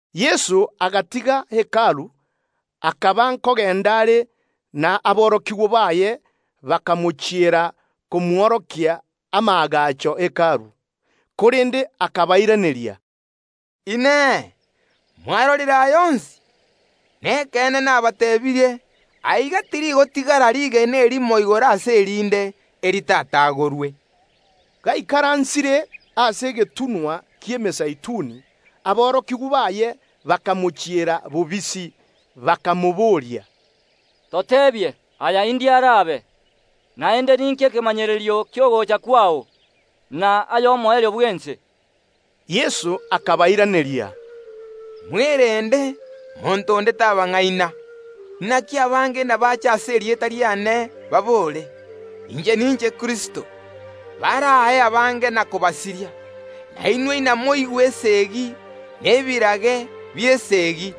Yeso agatiga Hekalu, akaba nkogenda are, na aborokigwa baye bakamochiera komworokia amaagacho ye Hekalu. Korende akabairaneria, “Inee! Mwarorire aya onsi? Nekeene nabateebirie: Tirigotigara rigena erimo aiga igoro ase erinde, eritatagorwe.” Gaikaransire ase egetunwa ki’Emezeituni, aborokigwa baye bakamochiera bobisi, bakamoboria, “Toteebie, aya indiriri arabe? Naende ninki ekemanyererio ki’ogocha kwao, na ay’omoerio bw’ense?” Yeso akabairaneria, Mwerende, monto onde tabang’aina. Inaki abange inabaache ase erieta riane, babore: Inche ninche Kristo; baraae abange na kobasiria. Na inwe inamoigwe esegi, ne chinkuma, chi’esegi;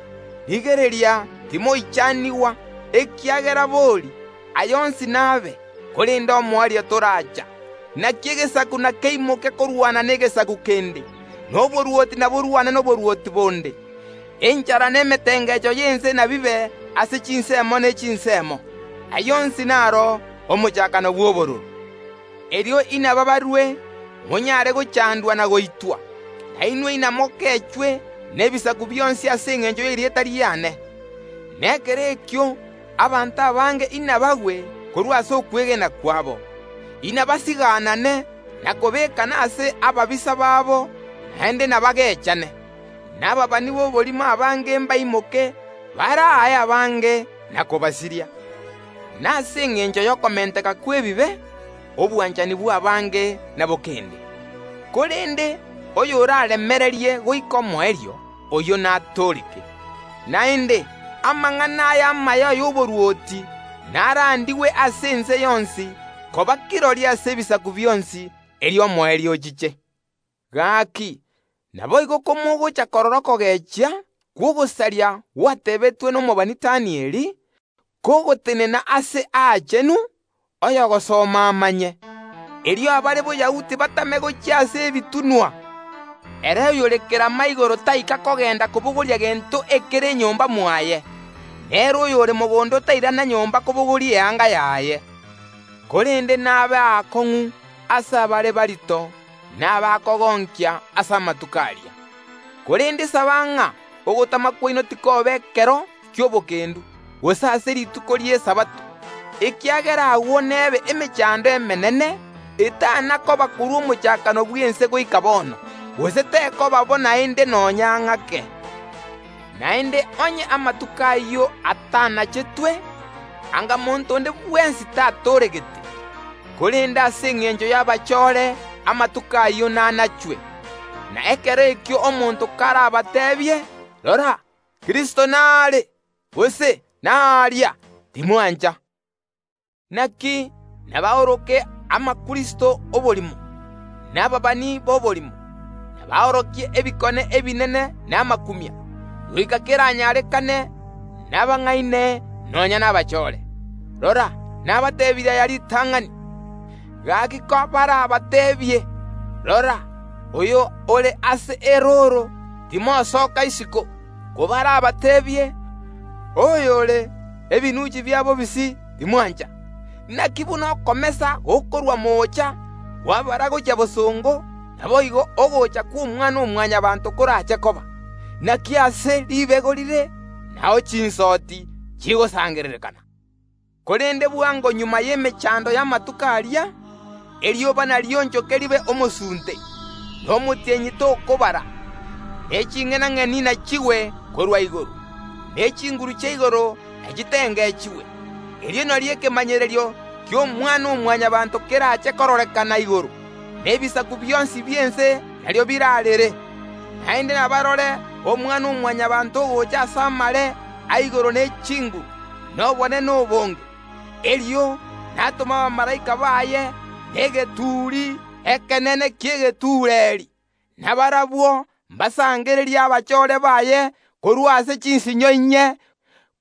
rigereria timoichanigwa, ekiagera ekeene, aya onsi nabe; korende omoerio toracha. Inaki egesaku nakeimoke korwana negesaku kende, na oborwoti inaborwane noborwoti bonde; enchara na emetengecho y’ense inabibe ase chinsemo ne chinsemo. Ayio onsi naro omochakano bw’obororo. Erio inabaabarue monyare gochandwa na goitwa, na inwe inamwangwe nebisaku bionsi ase engencho y’erieta riane. Na ekero ekio abanto abange inabagwe korwa ase okwegena kwabo, inabasigaanane na kobeekana ase ababisa babo, naende nabagechane, na ababani b’oborimo abange mbaimoke, baraae abange na kobasiria. Nase engencho y’okomenteka kw’ebibe, obwanchani bw’abange ’nabokende. Korende oy’oraaremererie goika omoerio, oyio natooreke. Naende, amang’ana aya amaya y’oborwoti narandigwe ase ense yonsi koba kirori ase ebisaku bionsi; erio omoerio ochiche. Gaki, naboigo kamogocha korora okogechia kw’ogosaria gwatebetwe nomobani Danieli, kogotenena Aase Aachenu (oy’ogosoma amanye), erio abare Boyahudi batame gochia ase ebitunwa. Ere oyore kerama igoro taika kogenda kobogoria gento ekere nyomba mwaye, na ere oyore mogondo tairana nyomba kobogoria eyanga yaye. Korende nebe aakong’u ase abare morito na abakogonkia ase amatuko aria. Korende saba ng’a ogotama kwaino tikoba ekero gi’etoigo, gose ase rituko ri’Esabato, ekiagera agwo n’ebe emechando emenene, etana koba korwa omochakano bw’ense goika bono, gose tekoba bo naende nonya ng’ake. Naende onye amatuko ayio atanachetwe, anga monto onde bwensi tatooregete; korende ase engencho y’abachore amatuko ayio nanachwe. Na ekero ekio omonto karabateebie: Rora, Kristo naa are! Gose: Ooria! Timwancha. Inaki nabaoroke abakristo b’oborimo, na ababani b’oborimo, nabaorokie ebikone ebinene na amakumia, goika keranyarekane, nabang’aine nonya nabachore. Rora, nabateebirie aya ritang’ani. Gaki, kobarabateebie: Rora, oyo ore ase erooro, timosoka isiko; kobarabateebie: Oyo ore ebinunchi bia bobisi, timwancha. Inaki buna okomesa gokorwa moocha kwabara gochia bosongo, naboigo ogocha kw’Omwana-o-Mwanyabaanto korache koba. Inaki aase ribego rire, nao chinsoti chigosangererekana. Korende bwango magega y’emechando y’amatuko aria, erioba narionchoke ribe omosunte, na omotienyi tokobara, ne ching’enang’eni nachigwe korwa igoro, ne chinguru chia igoro nachitengechigwe. Erio nario ekemanyererio ki’Omwana-o-Mwanyabaanto kerache kororekana igoro, na ebisaku bionsi bi’ense nario biraarere; naende nabarore omwana‐o‐Mwanyabaanto ogocha ase amare a igoro ne chinguru, na obonene obonge. Erio natome abamalaika baye na egeturi ekenene ki’egetuureri, na barabwo mbasangererie abachoore baye korwa ase chinsinyo inye,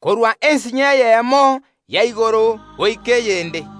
korwa ensinyo eyemo ya igoro goika eyende.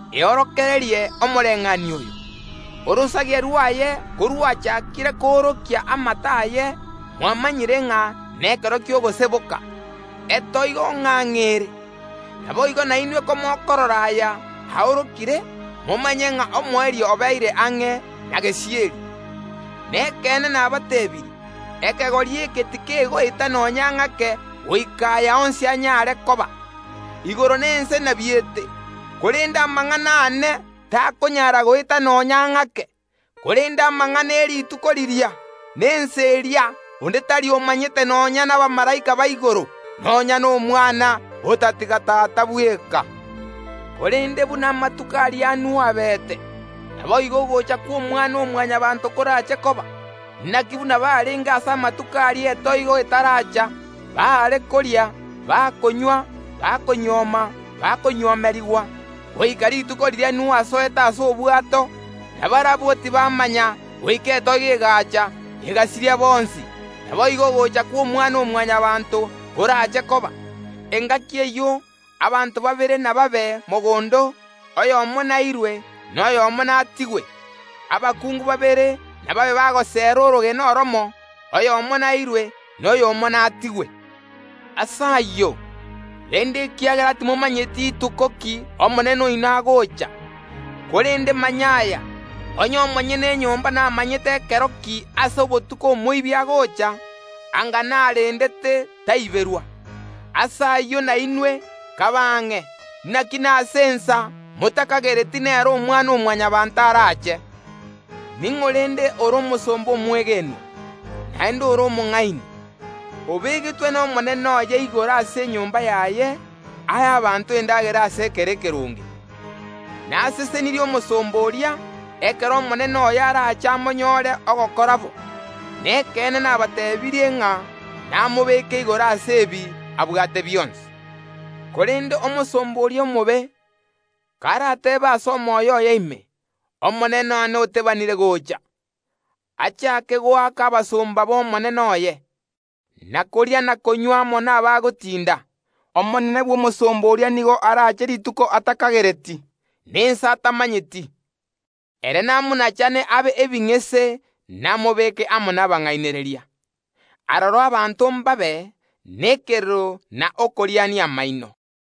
Eorokererie omobayeeno oyo korwa ase omoko: Orosagia rwaye korwachaakire koorokia amato aye, mwamanyire ng’a nekero ki’ogoseboka, egura gura ng’ang’e ere. Naboigo nainwe komokorora aya aorokire, momanye ng’a omoerio obeire ang’e na gesieri. Nekeene nabateebirie: Ekegori eke tikegoeta nonya ng’ake goika aya onsi anyare koba. Igoro na ense nabiete, korende amang’ana aane takonyara goeta nonya ng’ake. Korende amang’ana ye rituko riria, na ensa eria onde tari omanyete, nonya nabamalaika ba igoro, nonya n’Omwana, otatiga Tata bweka. Korende buna amatuko aria a Nuhu abeete, naboigo ogocha kw’Omwana-o-Mwanyabaanto korache koba. Inaki buna barenge ase amatuko aria etoigo etaracha, baare koria, bakonywa, bakonyuoma, bakonyuomerigwa, goika rituko riria Nuhu asoete ase obwato, na barabwo tibamanya goika etoigo egaacha, ekabasiria bonsi; naboigo ogocha kw’Omwana-o-Mwanyabaanto koraache koba. Engaki eyio abanto babere inababe mogondo; oyomo nairwe, na oyomo natigwe. Abakungu babere inababe bagoseera orogena oromo; oyomo nairwe, na oyomo natigwe. Ase ayio, renda, ekiagera timomanyeti ituko ki Omonene oino agocha. Korende manya aya, onye omonyene enyomba namanyete nkero ki ase obotuko omoibi agocha, anga narendete taiberwa. Ase ayio nainwe, kabe ang’e; naki ase ensa eria motakagereti nario Omwana-o-Mwanyabaanto araache. Ning’o rende ore omosomba omwegenwa, naende ore omong’aini, obegetwe nomonene oye igoro ase enyomba yaye, ae abanto endagera ase ekero kegwenerete? Nasesenirie omosomba oria, ekero omonene oye arache amonyore ogokora bo. Nekeene nabateebirie ng’a namobeke igoro ase ebi abwate bionsi. Korende omosomba oria omobe, karateebe ase omoyo oye ime: Omonene one otebanire goocha, achaake goaka abasomba b’omonene oye, na koria na konywa amo nabagotinda, omonene bw’omosomba oria nigo araache rituko atakagereti, na ensa atamanyeti; ere namonachane abe ebing’ese namobeeke amo nabang’ainereria. Aroro abanto ’mbabe nekerero na okoriania amaino.